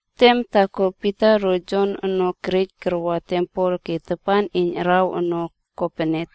Tem taako, Pita ro Jon ono kerej karaꞌa tempel ke tapan iyn araw ono kopene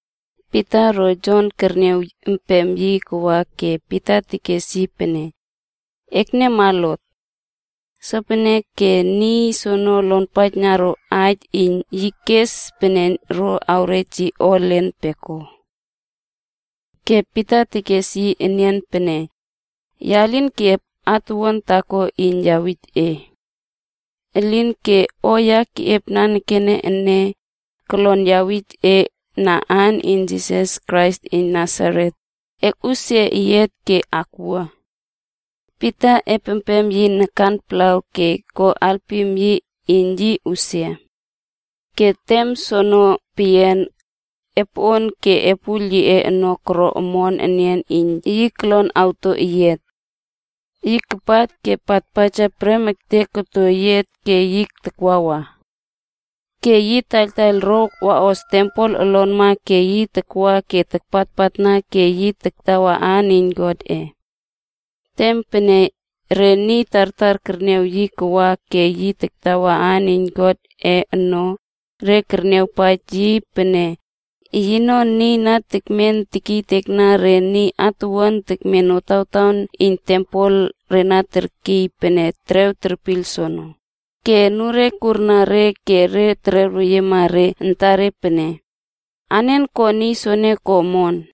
Pita ro Jon kerniaw empem yi kawa ke Pita tekes yi pene, “Ekniawma lot!” Sopeneke niy soono lonpaijna ro aij iyn yi kes pene ro awrej yi o elen peko. Ke Pita tekes yi enian pene, “Ya lin keꞌiep atuwuan taako iyn awij e. Elinke o ya keꞌiep nanekene ene, kolon ya awij e na aan iyn Jisas Krais iyn aimol Nasaret, e akꞌusia eyiat ke akwua.” Pita epem yi nakan palaw ke ko alpim yi iyn yi usia. Ke tem soono peyian, epoꞌon ke epuiyl yiꞌe ono koro nokuon enian iyn yi kolon awto eyiat. Yi kapat ke patpaja prem ektek koto eyiat ke yi takwawa. Ke yi taiyltaiyl ro waꞌos tempel olonma ke yi takwa ke takpatpatna ke yi taktawa aan iyn Godꞌe. Tem pene re niy tartar kerniaw yi akwa ke yi taktawa aan iyn Godꞌe ono, re kerniawpaij yi pene yino niy na tekmen tekiytekna re niy atuwuan tekmen notawtaon iyn tempel re na terkiy pene Terew Kerpiyl soono, ke anure kurna re ke re tererweyiema re antare pene, “Anen ko niy soono ko omon?”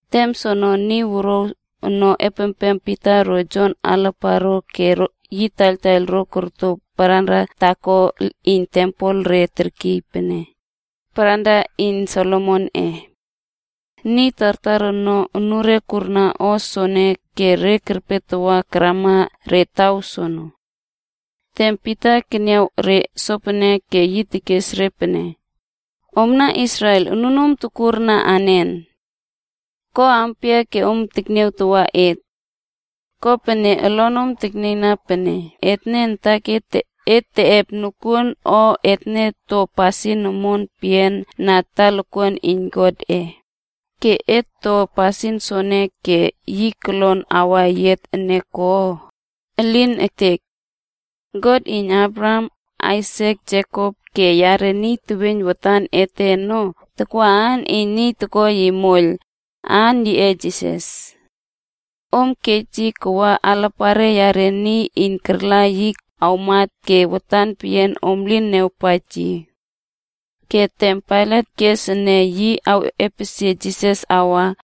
Tem soono niy wuruaw ono epempem Pita ro Jon alaparo ke yi kataiyl ro koto paranra taako iyn tempel re terkiy pene “Paranra iyn Solomonꞌe.” Niy tartar ono, unure kurna o soene ke re kerpe tawa karamana re taw soono. Tem Pita keniaw re sopene, ke yi tekes re pene, “Omna Israel, onunom tokurna anen? Ko ampia ke om tekniatow et? Kopene olonom teknieiyna pene etne antaket teꞌep nokuon o etne to pasin omon peyian na talakuan iyn Godꞌe ke et to niy soene ke yi kolon awa eyiat ene ko? Elin ektek! God iyn Abraham, Aisak, Jekop ke yare niy teweiyn watan ete ono tawa aan iyn niy toko yi moiyl, a aan yiꞌe Jisas. Om kej yi kawa alapare yare niy iyn arla yi awmat ke watan peyian om lin niawpaij yi. Ke tem Pailat kes ene yi awꞌepesie Jisas awa,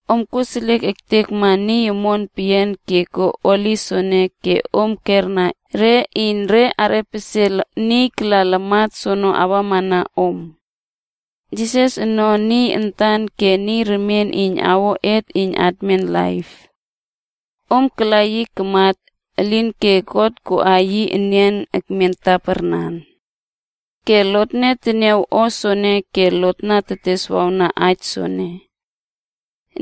Om koseliek ektekma niy omon peyian ke ko holi soene ke om kera re iyn re arꞌepesie niy kala lamat soono awamana om. Jisas ono niy antan ke niy remien iyn awo et iyn atmen laip. Om kala yi kamat, elinke God koꞌa yi enian ekmen taparnan. Ke lotne teniaw o soene ke lot na teteswawna aij soene.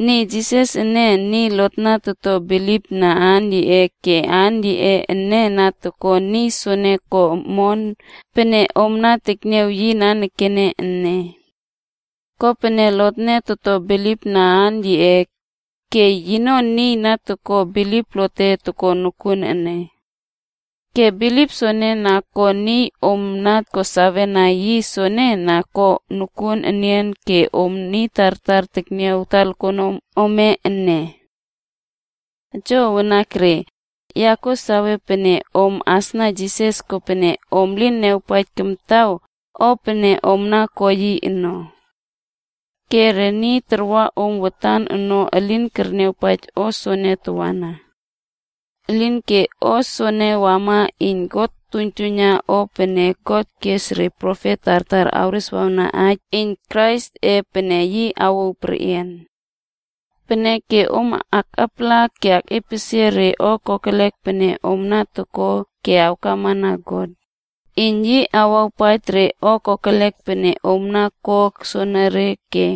Niy Jisas ene, niy lotne toto bilipna aan yiꞌe ke aan yiꞌe ene na ko niy soene ko omon pene om tekniaw yi nanekene ene. Kopene lotne toto bilipna aan yiꞌe, ke yino niy iyn na toko bilip lote toko nokuon ene. Ke bilip soene na ko niy om ko sawena yi soene na ko nokuon enian ke om niy tartar tekniaw talakuanom ome ene. “Jo wanakre, ya kuo sawe pene om asna Jisas kopene om lin niawpaij kamtaw o pene om na ko yi ono. Ke re niy tarwa om watan ono elin kerniawpaij o soene tawana. Elinke o soene wama iyn God tuiynjuiyna o pene God kes re profet tartar kereswawna aij iyn Kraisꞌe pene, yi awouw perꞌian. Peneke om aktapala ke akꞌepesie re o kokelek pene om toko ke awkamana God, iyn yi awawpaij re o kokelek pene om ko soonore ke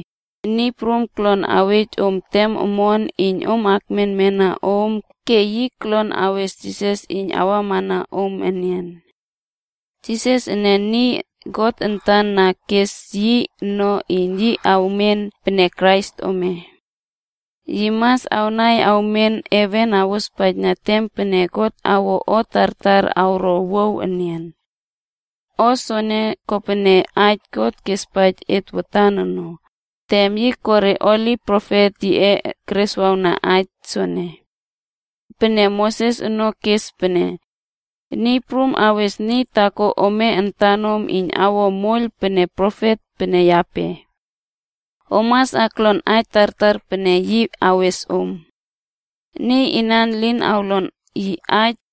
Niy Prum kolon awej om tem omon iyn om akmenmena om ke yi kolon awes Jisas iyn awamana om enian. Jisas ene niy God antan na keꞌes yi ono iyn yi awmen pene Krais ome. Yi mas awnai awmen heven awospaijna tem pene God awo o tartar awro owuaw enian. O soene kopene aij God kespaij et watan no, tem yi ko re holi profet yiꞌe kereswawna aij soene. Watan Moses ono kes pene, ‘Niy Prum God ome ono awes niy taako ome antanom iyn awo moiyl pene profet pene yape. Om mas aklonpaijna aij tartar pene yi awes om ono. Niy inan elin awlon yi aij,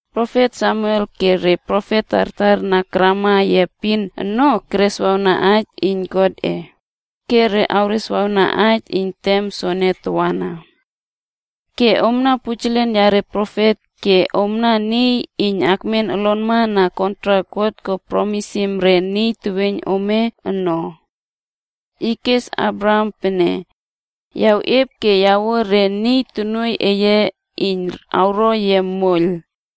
“profet Samuel ke re profet tartar na karama yi epin ono kereswawna aij iyn Godꞌe, ke re kereswawna aij iyn tem soene tawana. Ke omna pujelen yare profet ke omna niy iyn akmen olonma na kontrak God ko promisim re niy teweiyn ome ono. Yi kes Abraham pene, ‘Ya awꞌiep ke awuo re niy tonuoiy eye iyn awro yia moiyl,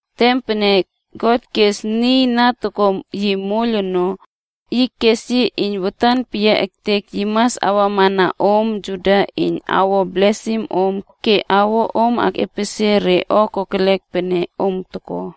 Tem pene God keꞌes niy na toko yi moiyl ono, yi kes yi iyn watan peyia ektek yi mas awamana omna Juda iyn awo blesim om ke awo om akꞌepesie re o kokelek pene om toko.”